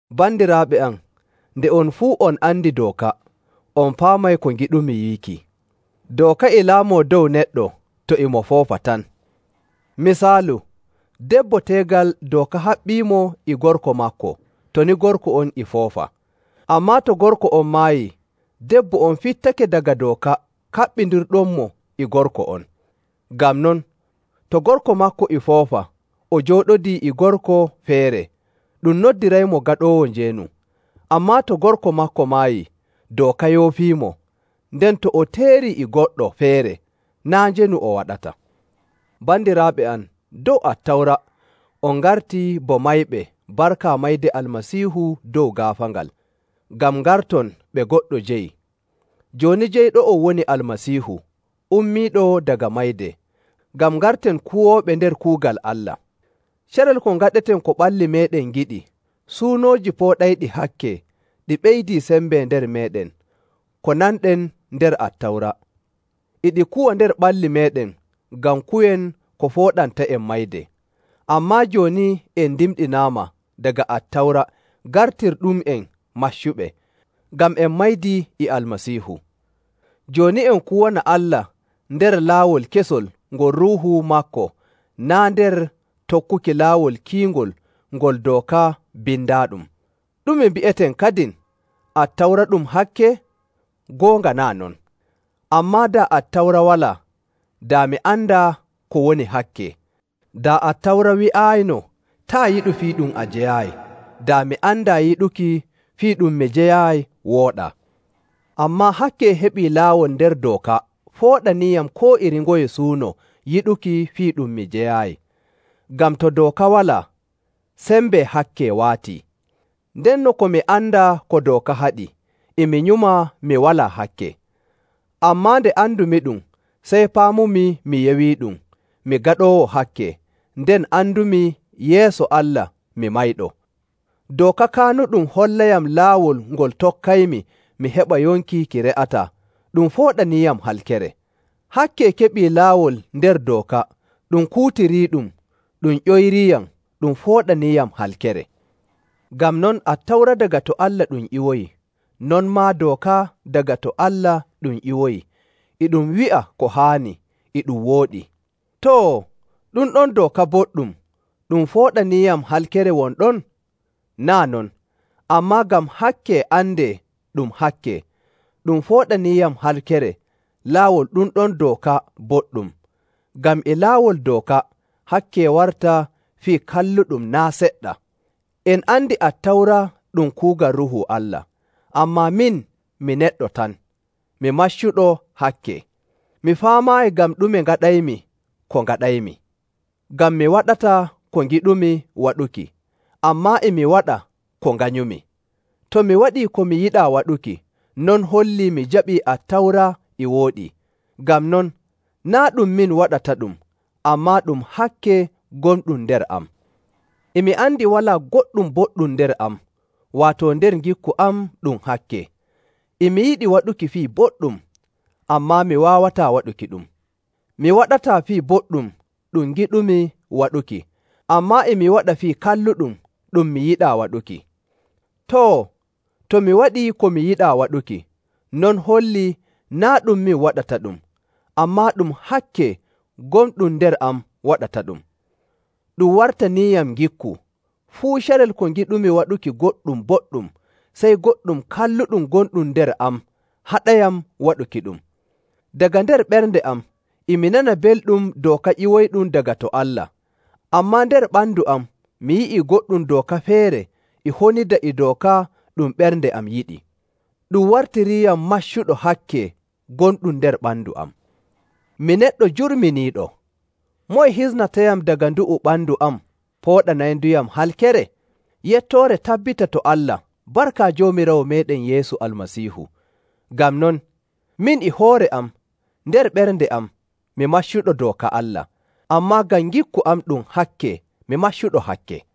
Bandiraaɓe am, nde on fuu on andi dooka, on paamay ko ngiɗmi wiiki. Dooka e laamoo dow neɗɗo to e mo foofa tan. Misaalu, debbo teegal dooka haɓɓiimo e gorko maako to ni gorko on e foofa. Ammaa to gorko on maayii, debbo on fittake daga dooka kaɓɓindirɗummo e gorko on. Ngam non, to gorko maako e foofa o jooɗodii e gorko feere, ɗum noddiraymo gaɗoowo njeenu. Ammaa to gorko maako maayii, dooka yoofiimo, nden to o teerii e goɗɗo feere, naa' njeenu o waɗata. Bandiraaɓe am, dow Attawra, on ngartii bo mayɓe barka mayde Almasiihu dow gaafaangal, ngam ngarton ɓe goɗɗo jeyi. Jooni jeyɗo'on woni Almasiihu ummiiɗo daga mayde, ngam ngarten kuwooɓe nder kuugal Allah. Carel ko ngaɗeten ko ɓalli meeɗen ngiɗi, suunooji pooɗayɗi hakke, ɗi ɓeydii sembe nder meeɗen ko nanɗen nder Attawra, e ɗi kuwa nder ɓalli meeɗen ngam kuwen ko fooɗanta'en mayde. Ammaa jooni en ndimɗinaama daga Attawra gartirɗum'en maccuɓe, ngam en maydii e Almasiihu. Jooni en kuwana Allah nder laawol kesol ngol Ruuhu maako, naa' nder tokkuki laawol kiingol ngol dooka bindaaɗum. Ɗume mbi'eten kadin? Attawra ɗum hakke? Goonga naa' non! Ammaa daa Attawra walaa, daa mi andaa ko woni hakke. Daa Attawra wi'aayino, “Taa' yiɗu fii ɗum a jeyaayi,” daa mi andaa yiɗuki fii ɗum mi jeyaayi wooɗaa.. Ammaa hakke heɓii laawol nder dooka fooɗaniiyam koo iri ngoye suuno yiɗuki fii ɗum mi jeyaayi. Ngam to dooka walaa, sembe hakke waatii. Ndenno ko mi andaa ko dooka haɗi, e mi nyuma mi walaa hakke. Ammaa nde andumiɗum, sey paamumi mi yewiiɗum, mi gaɗoowo hakke, nden andumi yeeso Allah mi mayɗo. Dooka kaanuɗum hollayam laawol ngol tokkaymi mi heɓa yonki ki re'ataa, ɗum fooɗaniiyam halkere. Hakke keɓii laawol nder dooka, ɗum kuutiriiɗum, ɗum ƴoyriiyam, ɗum fooɗaniiyam halkere.. Ngam non, Attawra daga to Allah ɗum ƴiwoyi, non maa dooka daga to Allah ɗum ƴiwoyi, e ɗum wi'a ko haani, e ɗum wooɗi. Too, ɗum ɗon dooka boɗɗum ɗum fooɗaniiyam halkere won ɗon? Naa' non! Ammaa ngam hakke andee ɗum hakke, ɗum pooɗaniiyam halkere laawol ɗum ɗon dooka boɗɗum, ngam e laawol dooka hakke warta fii kalluɗum naa' seɗɗa. En andi Attawra ɗum kuugal Ruuhu Allah, ammaa min mi neɗɗo tan, mi maccuɗo hakke. Mi faamaayi ngam ɗume ngaɗaymi ko ngaɗaymi. Ngam mi waɗataa ko ngiɗumi waɗuki, ammaa e mi waɗa ko nganyumi.. To mi waɗii ko mi yiɗaa waɗuki, non hollii mi jaɓii Attawra e wooɗi. Ngam non, naa' ɗum min waɗataɗum, ammaa ɗum hakke gonɗum nder am. E mi andi walaa goɗɗum boɗɗum nder am, waato nder ngikku am ɗum hakke. E mi yiɗi waɗuki fii boɗɗum, ammaa mi waawataa waɗukiɗum. Mi waɗataa fii boɗɗum ɗum ngiɗumi waɗuki, ammaa e mi waɗa fii kalluɗum ɗum mi yiɗaa waɗuki. Too, to mi waɗii ko mi yiɗaa waɗuki, non hollii naa' ɗum min waɗataɗum, ammaa ɗum hakke gonɗum nder am waɗataɗum. Ɗum wartaniiyam ngikku, fuu carel ko ngiɗumi waɗuki goɗɗum boɗɗum, sey goɗɗum kalluɗum gonɗum nder am haɗayam waɗukiɗum. Daga nder ɓernde am e mi nana belɗum dooka ƴiwoyɗum daga to Allah. Ammaa nder ɓandu am mi yi'ii goɗɗum dooka feere e honida e dooka ɗum ɓernde am yiɗi. Ɗum wartiriiyam maccuɗo hakke gonɗum nder ɓandu am. Mi neɗɗo jurminiiɗo! Moye hisnatayam daga ndu'u ɓandu am pooɗanaynduyam halkere? Yettoore tabbita to Allah barka Joomiraawo meeɗen Yeesu Almasiihu! Ngam non, min e hoore am nder ɓernde am mi maccuɗo dooka Allah, ammaa ngam ngikku am ɗum hakke mi maccuɗo hakke.